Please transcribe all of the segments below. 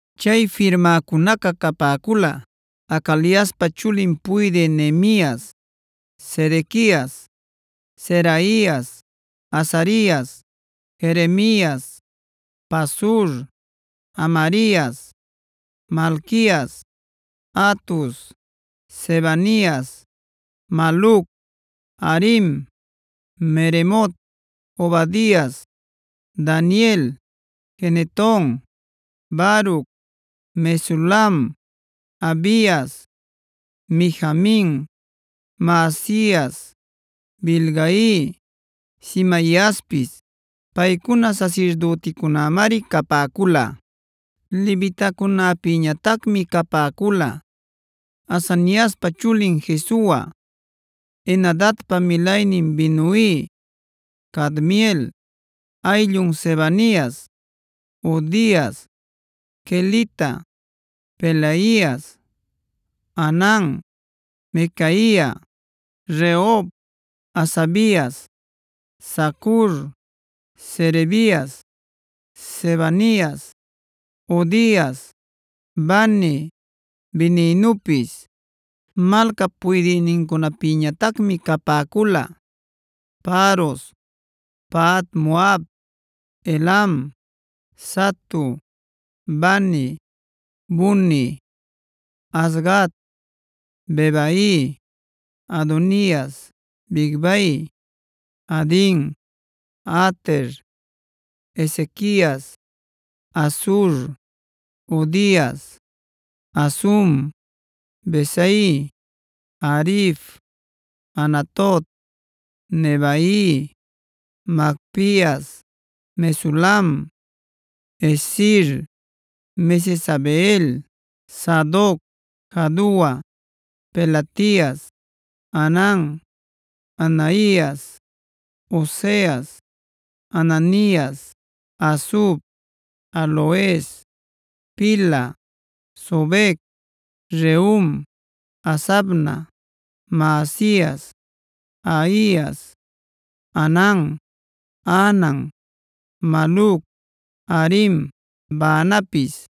Chay firmäcunaca capäcula: Hacaliaspa chulin puydï Nehemias, Sedequias, Seraias, Azarias, Jeremias, Pasur, Amarias, Malquias, Hatus, Sebanias, Maluc, Harim, Meremot, Obadias, Daniel, Gineton, Baruc, Mesulam, Abias, Mijamin, Maazias, Bilgai, Semaiaspis. Paycuna sasirdüticunämari capäcula. Levitacunäpïñatacmi capäcula: Azaniaspa chulin Jesua, Henadadpa milaynin Binui, Cadmiel, ayllun Sebanias, Hodias, Kelita, Pelaias, Hanan, Micaia, Rehob, Hasabias, Zacur, Serebias, Sebanias, Hodias, Bani, Beninupis. Malcap puydïnincunapïñatacmi capäcula: Paros, Pahat-moab, Elam, Zatu, Bani, Buni, Azgad, Bebai, Adonias, Bigvai, Adin, Ater, Ezequias, Azur, Hodias, Hasum, Bezai, Harif, Anatot, Nebai, Magpias, Mesulam, Hezir, Mesezabeel, Sadoc, Jadua, Pelatias, Hanan, Anaias, Oseas, Hananias, Hasub, Halohes, Pilha, Sobec, Rehum, Hasabna, Maasias, Ahias, Hanan, Anan, Maluc, Harim, Baanapis.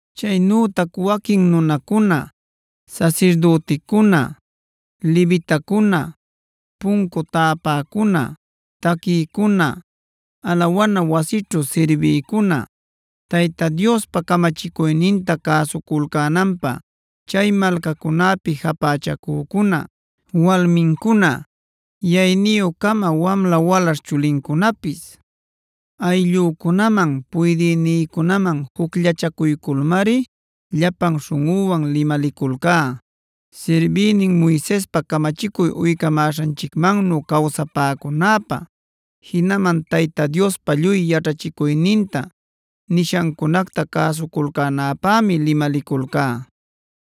Chaynütac waquin nunacuna,a sasirdüticuna, levitacuna, puncu täpäcuna, taquïcuna, alawana wasićhu sirbïcuna, Tayta Diospa camachicuyninta cäsuculcänanpä chay malcacunäpi japächacücuna, walmincuna, yayniyu-cama wamla walaśh chulincunapis, ayllücunaman puydïnïcunaman jucllachacuyculmari llapan śhunꞌüwan limaliculcá, sirbïnin Moisespa camachicuy uycamäśhanchicmannu cawsapäcunäpä. Jinaman Tayta Diospa lluy yaćhachicuyninta, nishancunacta cäsuculcänäpämi limaliculcá.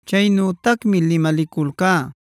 Chaynütacmi limaliculcá: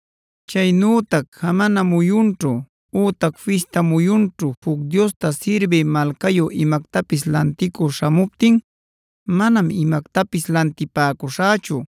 Chaynütac jamana muyunćhuc ütac fista muyunćhu juc diosta sirbï malcayu imactapis lanticü śhamuptin manam imactapis lantipäcuśhächu.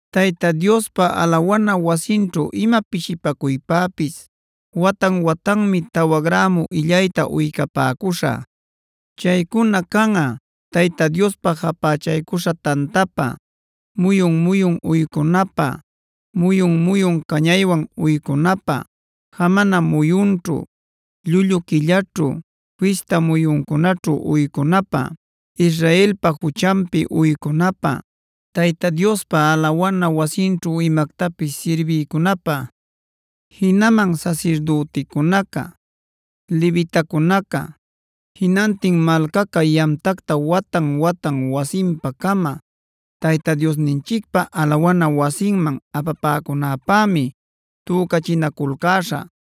“Tayta Diospa alawana wasinćhu ima pishipacuypäpis watan-watanmi tawa grämu illayta uycapäcuśhä.f Chaycuna canꞌa: Tayta Diospa japächaycuśha tantapä,g muyun-muyun uycunapä, muyun-muyun cañaywan uycunapä, jamana muyunćhu, llullu quillaćhu, fista muyuncunaćhu uycunapä, Israelpa juchanpi uycunapä, Tayta Diospa alawana wasinćhu imactapis sirbiycunapä. “Jinaman sasirdüticunaca, levitacunaca, jinantin malcaca yamtacta watan-watan wasinpa-cama Tayta Diosninchicpä alawana wasinman apapäcunäpämi tücachinaculcäśhä.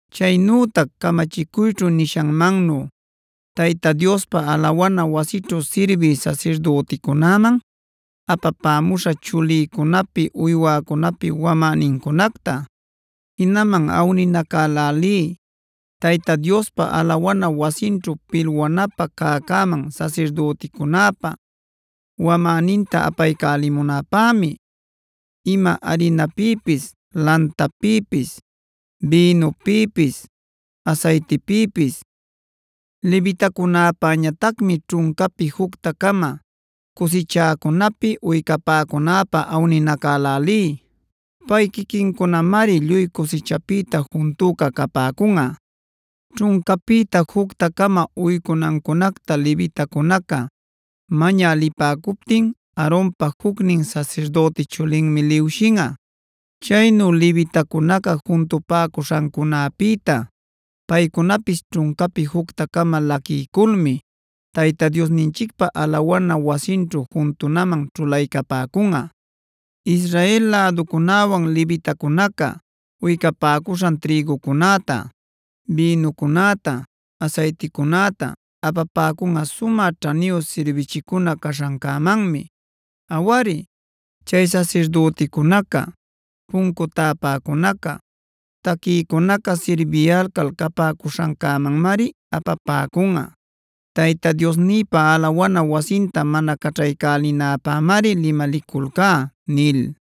Chaynütac camachicuyćhu nishanmannuj Tayta Diospa alawana wasićhu sirbï sasirdüticunäman apapämuśhä chulïcunapi uywäcunapi wamänincunacta. Jinaman awninacälälí Tayta Diospa alawana wasinćhu pilwanapä cäcäman sasirdüticunäpä wamäninta apaycälipunäpämi:k ima arinapïpis, lantapïpis, bïnupïpis, asaytipïpis. Levitacunäpäñatacmi ćhuncapi jucta-cama cusichäcunapi uycapäcunäpä awninacälälí. Pay quiquincunamari lluy cusichapïta juntüca capäcunꞌa. Ćhuncapïta jucta-cama uycunancunacta levitacunaca mañä lipäcuptin Aaronpa jucnin sasirdüti chulinmi liwshinꞌa. Chaynu levitacunaca juntupäcuśhancunäpïta paycunapis ćhuncapi jucta-cama laquiyculmi Tayta Diosninchicpä alawana wasinćhu juntunaman ćhulaycapäcunꞌa.l Israel läducunäwan levitacunaca uycapäcuśhan trïgucunäta, bïnucunäta, asayticunäta apapäcunꞌa sumä ćhaniyu sirbichicuna caśhancämanmi. Awari, chay sasirdüticunaca, puncu täpäcunaca, taquïcunaca sirbiyalcal capäcuśhancämanmari apapäcunꞌa. Tayta Diosnïpa alawana wasinta mana caćhaycälinäpämari limaliculcá” nil.